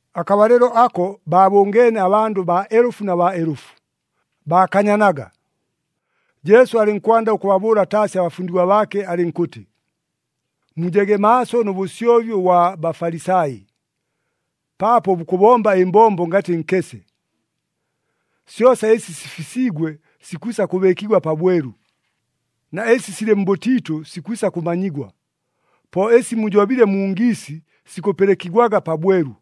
Akabalɨlo ako baabʉngeene abandʉ baelʉfu na baelʉfu, baakanyanaga. Jesu alɨnkwanda ʉkʉbabʉʉla taasi abafundigwa baake alɨnkʉtɨ, “Mujege maaso nʉ bʉsyobi ʉbwa Bafalisai, paapo bukʉbomba ɨmbombo ngatɨ nkese. Syosa ɨsi sifisiigwe sikwisa kʉbɨɨkigwa pabwelu, na ɨsi silɨ mbʉtiitʉ sikwisa kʉmanyigwa. Po ɨsi mujobile mu ngiisi, sikʉpɨlɨkigwaga pabwelu.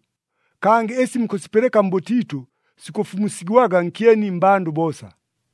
Kangɨ ɨsi mukʉsipɨlɨka mbʉtiitʉ, sikʉfumusigwaga nkyeni mmbandʉ boosa.”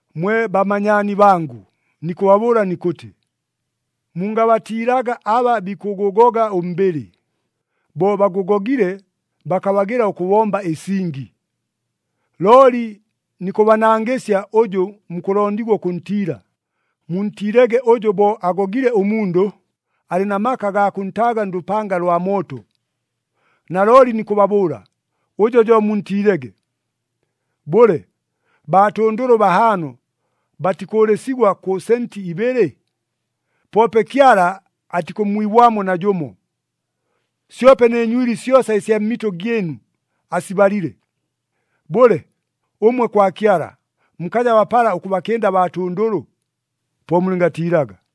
“Mwe bamanyaani bangʉ, nikʉbabʉʉla nikʉtɨ, mungabatiilaga aba bikʉgʉgoga ʉmbɨlɨ, bo bagʉgogile bakabagɨla ʉkʉbomba ɨsingi. Looli nikʉbanangɨsya ʉjʉ mukʉlondigwa ʉkʉntiila, muntiilege ʉjʉ bo agogile ʉmundʉ, alɨ na maka agaa kʉntaaga ndʉpanga lwa mooto. Nalooli nikʉbabʉʉla, ʉjo jo muntiilege! “Bʉle, baatʉndʉlʉ bahaano batikʉʉlɨsigwa kʉ senti ibɨlɨ? Poope Kyala atikʉmmwibwamo najʉmo. Syope nɨ nywili syosa ɨsya mmitʉ gyɨnu asibalile. Bʉle, ʉmwe kwa Kyala, mukaja bapala ʉkʉbakɨnda baatʉndʉlʉ? Po mulɨngatiilaga!”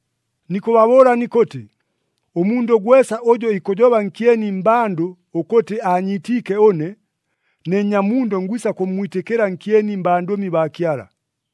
“Nikʉbabʉʉla nikʉtɨ, ʉmundʉ gwesa ʉjʉ ikʉjoba nkyeni mmbandʉ ʉkʉtɨ aanyiitiike ʉne, ne Nnyamundʉ ngwisa kʉmmwitɨkɨla nkyeni mbandʉmi baa Kyala.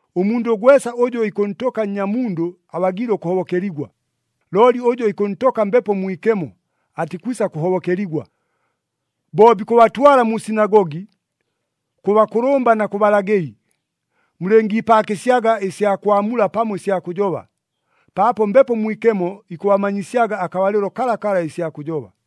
Ʉmundʉ gwesa ʉjʉ ikʉntʉka Nnyamundʉ abagiile ʉkʉhobokeligwa. Looli ʉjʉ ikʉntʉka Mbepo Mwikemo, atikwisa kʉhobokeligwa. “Bo bikʉbatwala mu sinagogi, kʉ bakʉlʉmba na kʉ balagɨli, mulɨngiipaakɨsyaga ɨsya kwamula pamo ɨsya kʉjoba, paapo Mbepo Mwikemo ikʉbamanyisyaga akabalɨlo kalakala ɨsya kʉjoba.”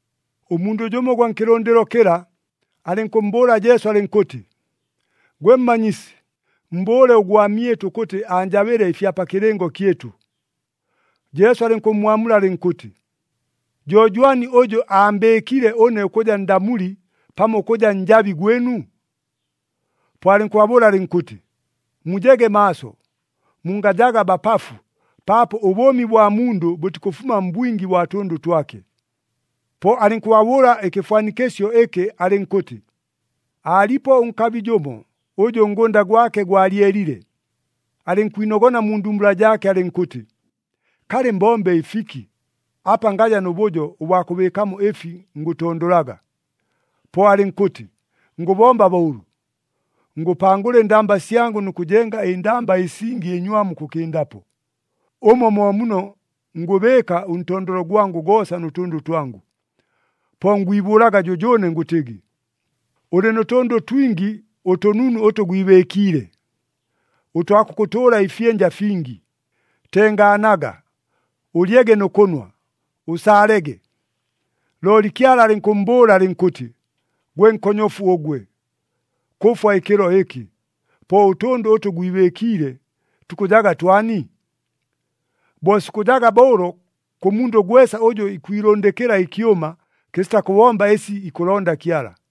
Ʉmundʉ jʉmo ʉgwa nkɨlʉndɨlo kɨla, alɨnkʉmmbʉʉla Jesu alɨnkʉtɨ, “Gwe Mmanyisi, mmbʉʉle ʉgwamyɨtʉ ʉkʉtɨ aanjabɨle ɨfya pa kɨlɨngo kyɨtʉ.” Jesu alɨnkʉmmwamula alɨnkʉtɨ, “Jo jwani ʉjʉ aambɨɨkile ʉne ʉkʉja ndamuli pamo ʉkʉja njabi gwɨnu?” Po alɨnkʉbabʉʉla alɨnkʉtɨ, “Mujege maaso, mungajaga bapafu, paapo ʉbʉʉmi bwa mundʉ bʉtikʉfuma mbwingi bwa tʉndʉ twake.” Po alɨnkʉbabʉʉla ɨkɨfwanikɨsyo ɨkɨ alɨnkʉtɨ, “Aalipo ʉnkabi jʉmo, ʉjʉ ʉngʉnda gwake gwalyelile. Alɨnkwinogona mu ndumbula jaake alɨnkʉtɨ, ‘Kalɨ, mbombe ɨfiki? Apa ngaja nʉ bʉjo ʉbwa kʉbɨɨkamo ɨfi ngʉtondolaga.’ Po alɨnkʉtɨ, ‘Ngʉbomba bo ʉlʉ, ngʉpangʉla ɨndamba syangʉ nʉ kʉjenga ɨndamba ɨsingi ɨnywamu ʉkʉkɨndapo. Ʉmo mo muno ngʉbɨɨka ʉntondolo gwangʉ goosa nʉ tʉndʉ twangʉ. Po ngwibʉʉlaga jʉjʉʉne ngʉtɨgɨ, “Ʉlɨ nʉ tʉndʉ twingi ʉtʉnunu ʉtʉ gwibɨɨkiile, ʉtwa kʉkʉtʉʉla ɨfyɨnja fingi. Tengaanaga, ʉlyege nʉ kʉnwa, ʉsaalege.” ’ Looli Kyala alɨnkʉmmbʉʉla alɨnkʉtɨ, ‘Gwe nkonyofu ʉgwe! Kʉfwa ɨkɨlo ɨkɨ! Po ʉtʉndʉ ʉtʉ gwibɨɨkiile, tukʉjaga twani?’ “Bo sikʉjaga bo ʉlo kʉ mundʉ gwesa ʉjʉ ikwilʉndɨkɨla ɨkyʉma, kɨsita kʉbomba ɨsi ikʉlonda Kyala.”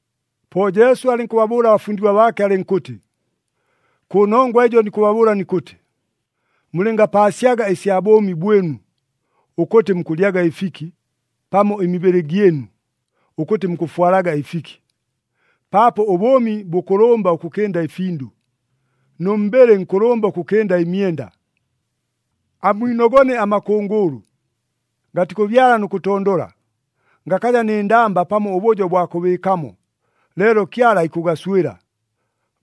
Po Jesu alɨnkʉbabʉʉla abafundigwa baake alɨnkʉtɨ, “Kʉnongwa ɨjo nikʉbabʉʉla nikʉtɨ, mulɨngapaasyaga ɨsya bʉʉmi bwɨnu, ʉkʉtɨ mukʉlyaga ɨfiki, pamo ɨmibɨlɨ gyɨnu, ʉkʉtɨ mukʉfwalaga ɨfiki. Paapo ʉbʉʉmi bʉkʉlʉmba ʉkʉkɨnda ɨfindʉ, nʉ mbɨlɨ nkʉlʉmba ʉkʉkɨnda ɨmyenda. Amwinogone amakʉngʉʉlʉ. Gatikʉbyala nʉ kʉtondola, gakaja nɨ ndamba pamo ʉbʉjo ʉbwa kʉbɨɨkamo, leelo Kyala ikʉgaswɨla.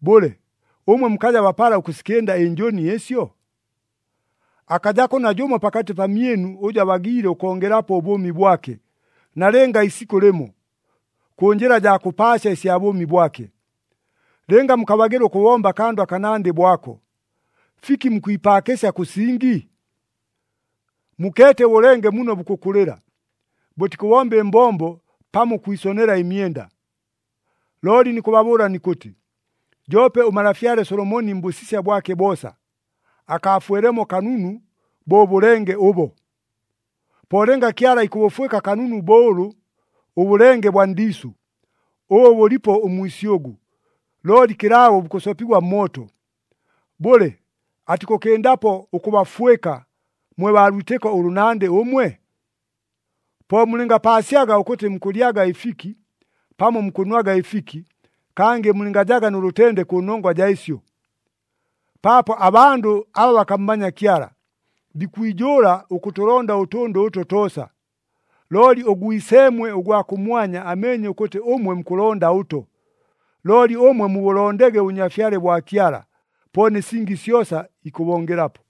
Bʉle, ʉmwe mukaja bapala ʉkʉsikɨnda ɨnjʉni ɨsyo? “Akajako najʉmo pakatɨ pamyɨnu ʉjʉ abagiile ʉkongelapo ʉbʉʉmi bwake nalɨnga isikʉ lɨmo, kʉ njɨla jaa kʉpaasya ɨsya bʉʉmi bwake. Lɨnga mukabagɨla ʉkʉbomba akandʉ akanandɨ bo ako, fiki mukwipaakɨsya kʉ singi? “Mukeete ʉbʉlenge muno bukʉkʉlɨla. Bʉtikʉbomba ɨmbombo pamo ʉkwisonela ɨmyenda. Looli nikʉbabʉʉla nikʉtɨ, joope ʉmalafyale Solomoni mbʉsisya bwake boosa, akaafwelemo kanunu bo ʉbʉlenge ʉbo! Po lɨnga Kyala ikʉbʉfwɨka kanunu bo ʉlʉ ʉbʉlenge bwa ndiisʉ, ʉbʉ bʉlipo ʉmwisyʉgʉ, looli kɨlaabo bukʉsopigwa mmooto, bʉle atikʉkɨndapo ʉkʉbafwɨka, mwe baa lwitɨko ʉlʉnandɨ ʉmwe? “Po mulɨngapaasyaga ʉkʉtɨ mukʉlyaga ɨfiki, pamo mukʉnwaga ɨfiki, kangɨ mulɨngajaga nʉ lʉtende kʉnongwa jaa ɨsyo. Paapo abandʉ aba bakammanya Kyala, bikwijʉʉla ʉkʉtʉlonda ʉtʉndʉ ʉto toosa, looli ʉGwiseemwe ʉgwa kʉmwanya ameenye ʉkʉtɨ ʉmwe mukʉlonda ʉto! Looli ʉmwe mubʉlondege ʉBʉnyafyale bwa Kyala, po nɨ singi syosa ikʉbongelapo.”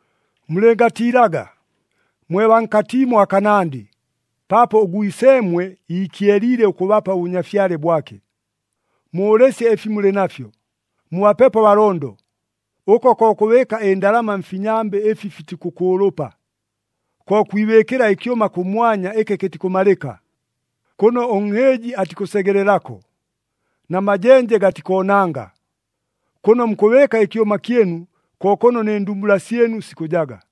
“Mulɨngatiilaga, mwe baa nkatiimo akanandɨ, paapo ʉGwiseemwe iikyeliile ʉkʉbapa ʉBʉnyafyale bwake. Mʉʉlɨsye ɨfi mulɨ nafyo, mubapepo abalondo. Ʉko ko kʉbɨɨka ɨndalama mfinyambɨ ɨfi fitikʉkʉʉlʉpa, ko kwibɨɨkɨla ɨkyʉma kʉmwanya ɨkɨ kɨtikʉmalɨka, kʉno ʉnhɨɨji atikʉsegelelako, na majenje gatikoonanga. Kʉno mukʉbɨɨka ɨkyʉma kyɨnu, ko kʉno nɨ ndumbula syɨnu sikʉjaga.”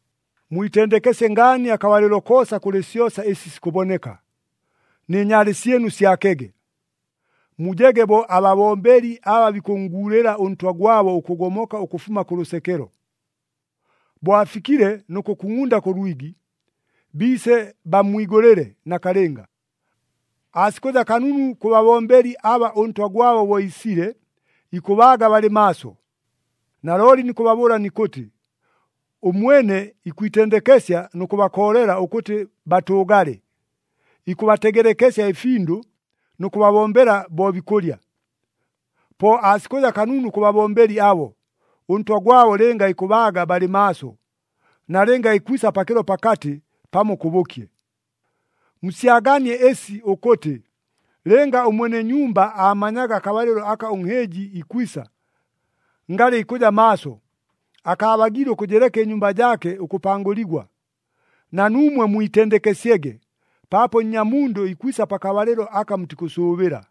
“Mwitendekesye ngaani akabalɨlo koosa kʉlɨ syosa ɨsi sikʉboneka, nɨ nyaale syɨnu syakege. Mujege bo ababombeli aba bikʉnnguulɨla ʉntwa gwabo ʉkʉgomoka ʉkʉfuma kʉ lʉsekelo. Bo afikile nʉ kʉkungʼunda kʉ lwigi, biise bammwigʉlɨle nakalɨnga. Aasikʉja kanunu kʉ babombeli aba ʉntwa gwabo bo iisile, ikʉbaaga balɨ maaso. Nalooli nikʉbabʉʉla nikʉtɨ, ʉmwene ikwitendekesya nʉ kʉbakoolela ʉkʉtɨ batʉʉgale, ikʉbategelekesya ɨfindʉ, nʉ kʉbabombela bo bikʉlya. Po aasikʉja kanunu kʉ babombeli abo, ʉntwa gwabo lɨnga ikʉbaaga balɨ maaso, nalɨnga ikwisa pakɨlo pakatɨ, pamo kʉbʉkye. “Musyaganie ɨsi ʉkʉtɨ, lɨnga ʉmwene nyumba aamanyaga akabalɨlo aka ʉnhɨɨji ikwisa, ngalɨ ikʉja maaso, akaabagiile ʉkʉjɨleka ɨnyumba jaake ʉkʉpangʉligwa. Na nuumwe mwitendekesyege, paapo Nnyamundʉ ikwisa pakabalɨlo aka mutikʉsʉʉbɨla.”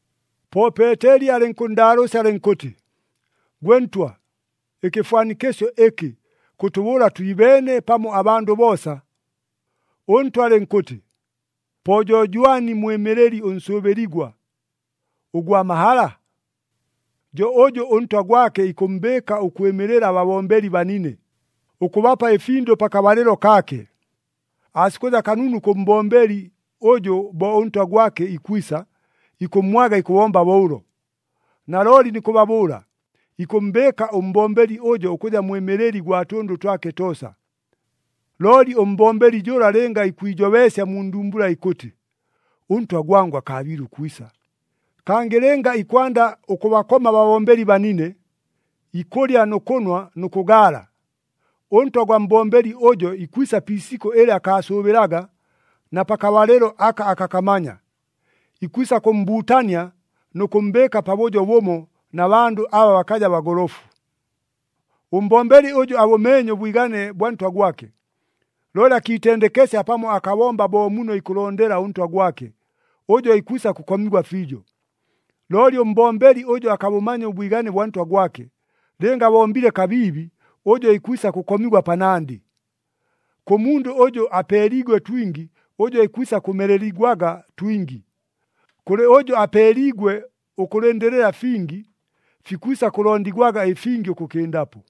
Po Peeteli alɨnkʉnndaalʉʉsya alɨnkʉtɨ, “Gwe Ntwa, ɨkɨfwanikɨsyo ɨkɨ, kʉtʉbʉʉla twibeene pamo abandʉ boosa?” ɄNtwa alɨnkʉtɨ, “Po jo jwani mwɨmɨlɨli ʉnsʉʉbɨligwa, ʉgwa mahala? Jo ʉjʉ ʉntwa gwake ikʉmmbɨɨka ʉkwɨmɨlɨla ababombeli banine, ʉkʉbapa ɨfindʉ pakabalɨlo kaake. Aasikʉja kanunu kʉ mbombeli ʉjʉ bo ʉntwa gwake ikwisa, ikʉmmwaga ikʉbomba bo ʉlo. Nalooli nikʉbabʉʉla, ikʉmmbɨɨka ʉmbombeli ʉjo ʉkʉja mwɨmɨlɨli gwa tʉndʉ twake toosa. Looli ʉmbombeli jʉla lɨnga ikwijobeesya mu ndumbula ikʉtɨ, ‘Ʉntwa gwangʉ akaabiile ʉkwisa,’ kangɨ lɨnga ikwanda ʉkʉbakoma ababombeli banine, ikʉlya nʉ kʉnwa nʉ kʉgaala, ʉntwa gwa mbombeli ʉjo ikwisa pi isikʉ ɨlɨ akaasʉʉbɨlaga na pakabalɨlo aka akakamanya. Ikwisa kʉmmbuutania nʉ kʉmmbɨɨka pabʉjo bʉmo na bandʉ aba bakaja bagolofu. “Ʉmbombeli ʉjʉ abʉmeenye ʉbwigane bwa ntwa gwake, looli akiitendekesya pamo akabomba bo muno ikʉlondela ʉntwa gwake, ʉjo ikwisa kʉkomigwa fiijo. Looli ʉmbombeli ʉjʉ akabʉmanya ʉbwigane bwa ntwa gwake, lɨnga abombile kabiibi, ʉjo ikwisa kʉkomigwa panandɨ. Kʉ mundʉ ʉjʉ apeeliigwe twingi, ʉjo ikwisa kʉmeleligwaga twingi. Kʉlɨ ʉjʉ apeeliigwe ʉkʉlɨndɨlɨla fingi, fikwisa kʉlondigwaga ɨfingi ʉkʉkɨndapo.”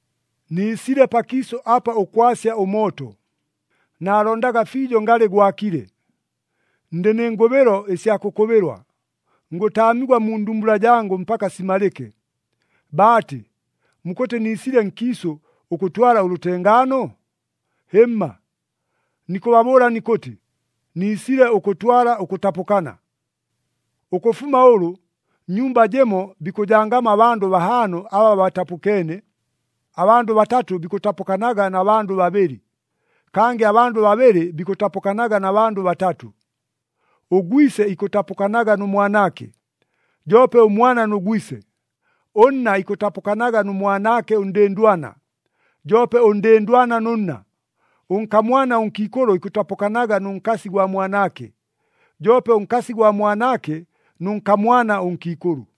“Niisile pakiisʉ apa ʉkwasya ʉmooto, naalondaga fiijo ngalɨ gwakile! Ndɨ nɨ ngʉbɨlo ɨsya kʉkʉbɨlwa, ngʉtaamigwa mu ndumbula jangʉ mpaka simalɨke! Baatɨ, mukʉtɨ niisile nkiisʉ ʉkʉtwala ʉlʉtengaano? Hɨmma! Nikʉbabʉʉla nikʉtɨ, niisile ʉkʉtwala ʉkʉtapʉkana. Ʉkʉfuma ʉlʉ, nnyumba jɨmo bikʉjangamo abandʉ bahaano aba batapʉkeene. Abandʉ batatʉ bikʉtapʉkanaga na bandʉ babɨlɨ, kangɨ abandʉ babɨlɨ bikʉtapʉkanaga na bandʉ batatʉ. Ʉgwise ikʉtapʉkanaga nʉ mwanaake, joope ʉmwana nʉ gwise. Ʉnna ikʉtapʉkanaga nʉ mwanaake ʉndɨndwana, joope ʉndɨndwana nʉ nna. Ʉnkamwana ʉnkiikʉlʉ ikʉtapʉkanaga nʉ nkasi gwa mwanaake, joope ʉnkasi gwa mwanaake nʉ nkamwana ʉnkiikʉlʉ.”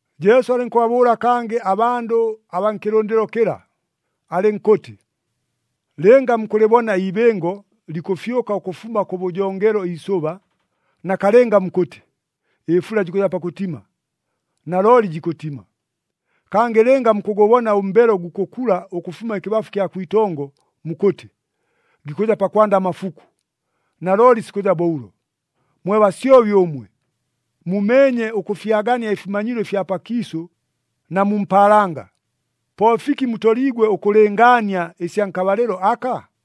Jesu alɨnkʉbabʉʉla kangɨ abandʉ abaa nkɨlʉndɨlo kɨla, alɨnkʉtɨ, “Lɨnga mukʉlɨbona iibɨngo likʉfyʉka ʉkʉfuma kʉbʉjongelo iisʉba, nakalɨnga mukʉtɨ, ‘Ɨfula jikʉja pakʉtima,’ nalooli jikʉtima. Kangɨ lɨnga mukʉgʉbona ʉmbelo gukʉkula ʉkʉfuma ɨkɨbafu kya kwitongo, mukʉtɨ, ‘Gikʉja pakwanda amafuku,’ nalooli sikʉja bo ʉlo. Mwe basyobi ʉmwe! Mumeenye ʉkʉfyagania ɨfimanyilo ɨfya pakiisʉ na mu mpaalanga. Po fiki mutoliigwe ʉkʉlɨngaania ɨsya nkabalɨlo aka?”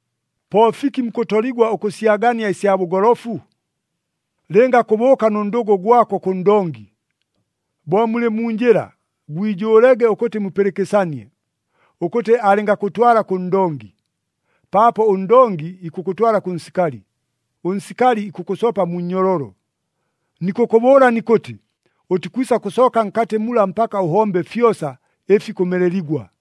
“Po fiki mukʉtoligwa ʉkʉsyagania ɨsya bʉgolofu? Lɨnga kʉbʉʉka nʉ ndʉgʉ gwako kʉ ndongi, bo mulɨ mu njɨla gwijʉʉlege ʉkʉtɨ mupɨlɨkɨsanie, ʉkʉtɨ alɨngakʉtwala kʉ ndongi, paapo ʉndongi ikʉkʉtwala kʉ nsikali, ʉnsikali ikʉkʉsopa mu nnyololo. Nikʉkʉbʉʉla nikʉtɨ, ʉtikwisa kʉsooka nkatɨ mula mpaka ʉhombe fyosa, ɨfi kʉmeleligwa!”